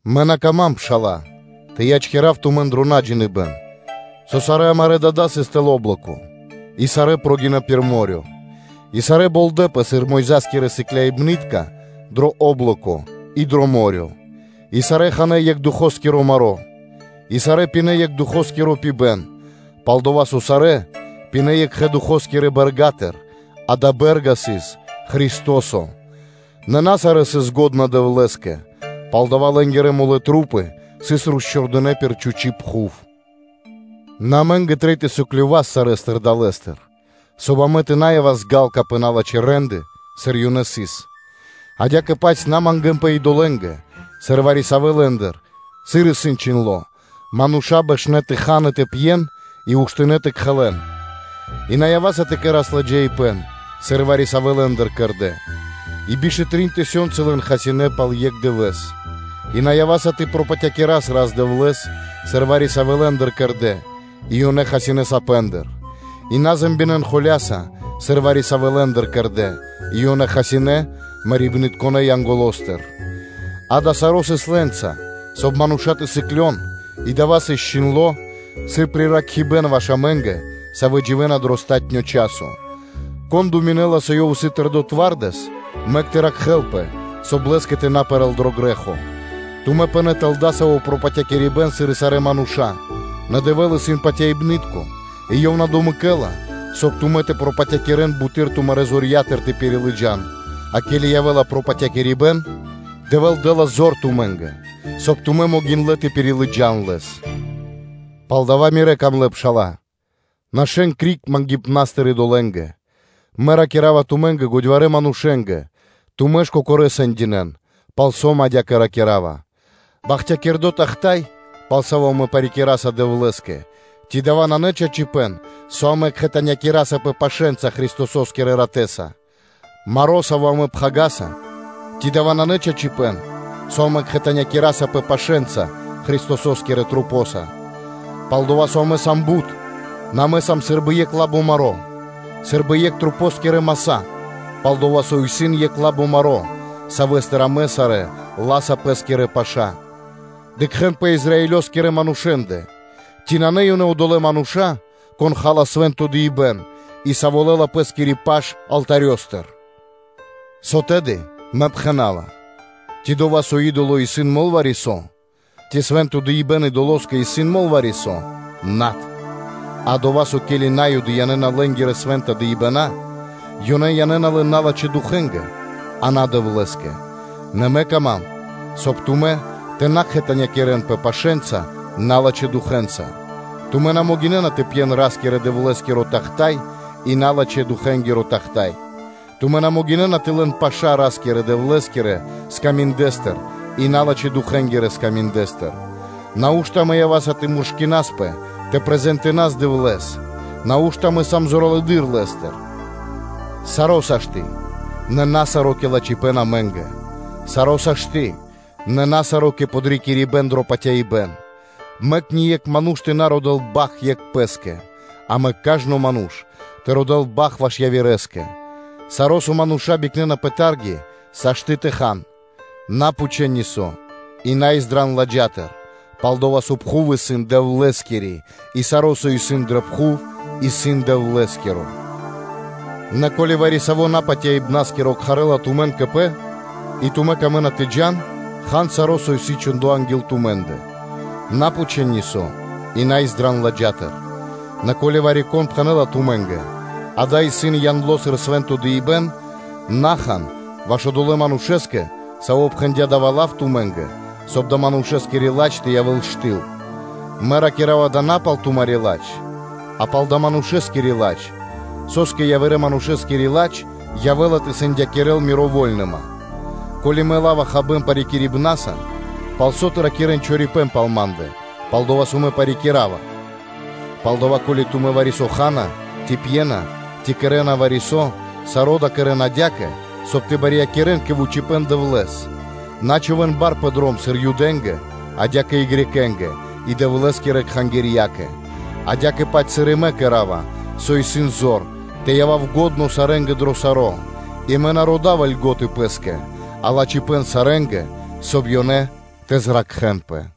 Мэ на кама́м, пшала́лэ, тэ ячкирав тумэн дро наджиныбэн, со сарэ́ амарэ́ дада́ сыс тэл о́блоко (синэпо), и сарэ́ прогинэ́ пир мо́рё (дэрья́в); и сарэ́ болдэпэ сыр Мойза́скирэ сыкляибны́тка дро о́блоко и дро мо́рё (дэрья́в); и сарэ́ ханэ́ екх Духоскиро маро́, и сарэ́ пинэ́ екх Духоскиро пибэ́н, пал-дова́ со сарэ́ пинэ́ екхэ Духо́скирэ бэрга́тыр: дая́ бэ́рга сыс Христо́со; нэ на сарэ́ сыс лачхэ́ Дэвлэ́скэ, палдава́ лэ́нгирэ тру́пы сыс росчхурдынэ пир чхучи́ пхув. Нэ амэ́нгэ трэй тэ сыклёвас сарэ́стыр далэ́стыр, соб (кай) амэ тэ на явас ґалка (жадна) пэ налачхэ́ рэ́нды, сыр ёнэ сыс. Адя́кэ-паць тумэ́ тэ на мангэ́нпэ идолэ́нгэ, сыр вари-савэ́ лэ́ндыр; сыр исын чхиндло́: “Мануша́ бэшнэ́ тэ хан и тэ пьен, и уштынэ́ тэ кхэлэн.” И на ява́са тэ кэра́с биладжаипэ́н, сыр вари-савэ́ лэ́ндыр кэрдэ́, и биш тэ трин тысёнцы лэн хасинэ́ пал екх дывэ́с. И на ява́са тэ пропатякирас Рас-Дэвлэ́с, сыр вари-савэ́ лэ́ндыр кэрдэ́, и ёнэ хасинэ́ сапэндыр. И на ракирэ́н холя́са, сыр вари-савэ́ лэ́ндыр кэрдэ́, и ёнэ хасинэ́ Марибнытконэ́ Янголостыр. Дава́ саро́ сыс лэ́нца, соб (кай) мануша́ тэ сыклён, и дава́ сыс чхиндло́ сыр приракхибэн ваш амэ́нгэ, савэ́ дживэ́на дро палатуно́ часо. Кон думинэ́ла, со ёв исын тэрдо́ твардэс, мэк тэ ракхэлпэ, соб (кай) лэ́скэ тэ на пэрэ́л дро грэ́хо. Тумэ́ пынэ́ тэл дасаво пропатякирибэн сыр и сарэ́ мануша́; нэ Дэвэ́л исын патяибны́тко, и Ёв на домэкэла, соб (кай) тумэн тэ пропатякирэн буты́р тумарэ́ зорья́тыр тэ пирилыджан; а ке́ли явэ́ла пропатякирибэн, Дэвэ́л дэ́ла зор тумэ́нгэ, соб (кай) тумэ́ могиндлэ́ тэ пирилыджан лэс. Палдава́, мирэ́ дро́га пшала́лэ, нашэ́н криг мангипнастыр идолэ́нгэ. Мэ ракира́ва тумэ́нгэ, годьварэ́ манушэ́нгэ; тумэ́ ж кокорэ́ сэндинэ́н, палсо́ мэ адя́кэ ракира́ва. Бахтякирдо́ тахта́й (чаша), пал саво́ амэ парикираса Дэвлэ́скэ, ци дава́ нанэ чачипэ́н; со амэ кхэтанякирасапэ пашэнца Христосо́скирэ Ратэ́са? Маро, саво́ амэ пхагираса, ци дава́ нанэ чачипэ́н, со амэ кхэтанякирасапэ пашэнца Христосо́скирэ Масэнца. Пал-дова́ со амэ сам бут, нэ амэ сам сы́рбы екх лабо маро́, сы́рбы екх маса́; пал-дова́ со исын екх лабо маро́, савэ́стыр амэ сарэ́ ла́са пэ́скирэ паша́. Дыкхэ́н пэ Израилёскиро манушэ́ндэ: ци нанэ ёнэ одолэ́ мануша́, кон ха́ла свэ́нто дыибэ́н, и саво́ лэ́ла пэ́скири паш алтарёстыр? Со тэды мэ пхэна́ва? Ци дова́, со идоло исын мол вари-со? Ци свэ́нто дыибэ́н идолоскэ исын мол вари-со? Над. А дова́, со ке́ли На́юды янэ́на лэ́нгирэ свэ́нта дыибэна́, ёнэ янэ́на лэн налачхэ́ духэнгэ, а на Дэвлэ́скэ. Нэ мэ кама́м, соб (кай) тумэ́ тэ на кхэтанякирэнпэ пашэнца налачхэ́ духэнца. Тумэ́ на могинэ́на тэ пьен Ра́скирэ-Дэвлэ́скиро тахта́й, и налачхэ́-духэнгиро тахта́й: тумэ́ на могинэ́на тэ лэн паша́ Ра́скирэ-Дэвлэ́скирэ скаминдэстыр и налачхэ́-духэнгирэ скаминдэстыр. Нау́што амэ ява́са тэ муршкинаспэ тэ холякирас Дэвлэ́с? Нау́што амэ сам зоралэды́р Лэ́стыр? Саро́ сашты́ (можна), нэ на саро́ кэ лачхипэ́н амэ́нгэ; саро́ сашты́, нэ на саро́ кэ подрикирибэ́н дро патяибэ́н. Мэк ние́кх ману́ш тэ на родэ́л бахт екх пэ́скэ, а мэк кажно ману́ш тэ родэ́л бахт ваш явирэскэ. Саро́, со мануша́ бикнэна пэ тарги, сашты́ тэ хан, на пхучэ́н нисо́, и на издран ладжатыр. Пал-дова́ со пхув исын Дэвлэ́скири и саро́, со исын пэ пхув, исын Дэвлэ́скиро. Нэ ко́ли вари-саво́ напатяибнаскиро кхарэ́ла тумэн кэ пэ, и тумэ́ камэ́на тэ джа́н, хан саро́, со исын чхудо анги́л тумэ́ндэ, на пхучэ́н нисо́ и на издран ладжатыр. Нэ ко́ли вари-кон пхэнэ́ла тумэ́нгэ: ґа́да, исын яндло сыр свэ́нто дыибэ́н, на хан ваш одолэ́ манушэ́скэ, саво́ пхэндя́ дава́ лав тумэ́нгэ, соб (кай) адалэ́ манушэскири ладж тэ явэ́л штыл; мэ ракира́ва дава́ на пал тумари́ ладж, а пал дая́ манушэскири ладж: со́скэ явирэ манушэскири ладж явэ́ла тэ сэндякирэ́л мири́ вольныма? Ко́ли мэ ла́ва хабэ́н парикирибнаса, палсо́ тэ ракирэ́н чорипэ́н пал ма́ндэ, пал дова́ со мэ парикирава. Палдава́, ко́ли тумэ́ вари-со ха́на, ци пьена, ци кэрэ́на вари-со, саро́ дава́ кэрэ́н адя́кэ, соб (кай) тэ барьякирэ́н кэ вучипэ́н Дэвлэ́с. На чхувэ́н бар пэ дром сыр Юдэ́нгэ, адя́кэ-паць и Грекэ́нгэ (Баламэ́нгэ), и Дэвлэ́скирэ кхангирьякэ. Адя́кэ-паць сыр и мэ кэра́ва, со исын зор, тэ явав лачхо́ сарэ́нгэ дро саро́; и мэ на родава льго́та пэ́скэ, а лачхипэ́н сарэ́нгэ, соб (кай) ёнэ тэ зракхэнпэ.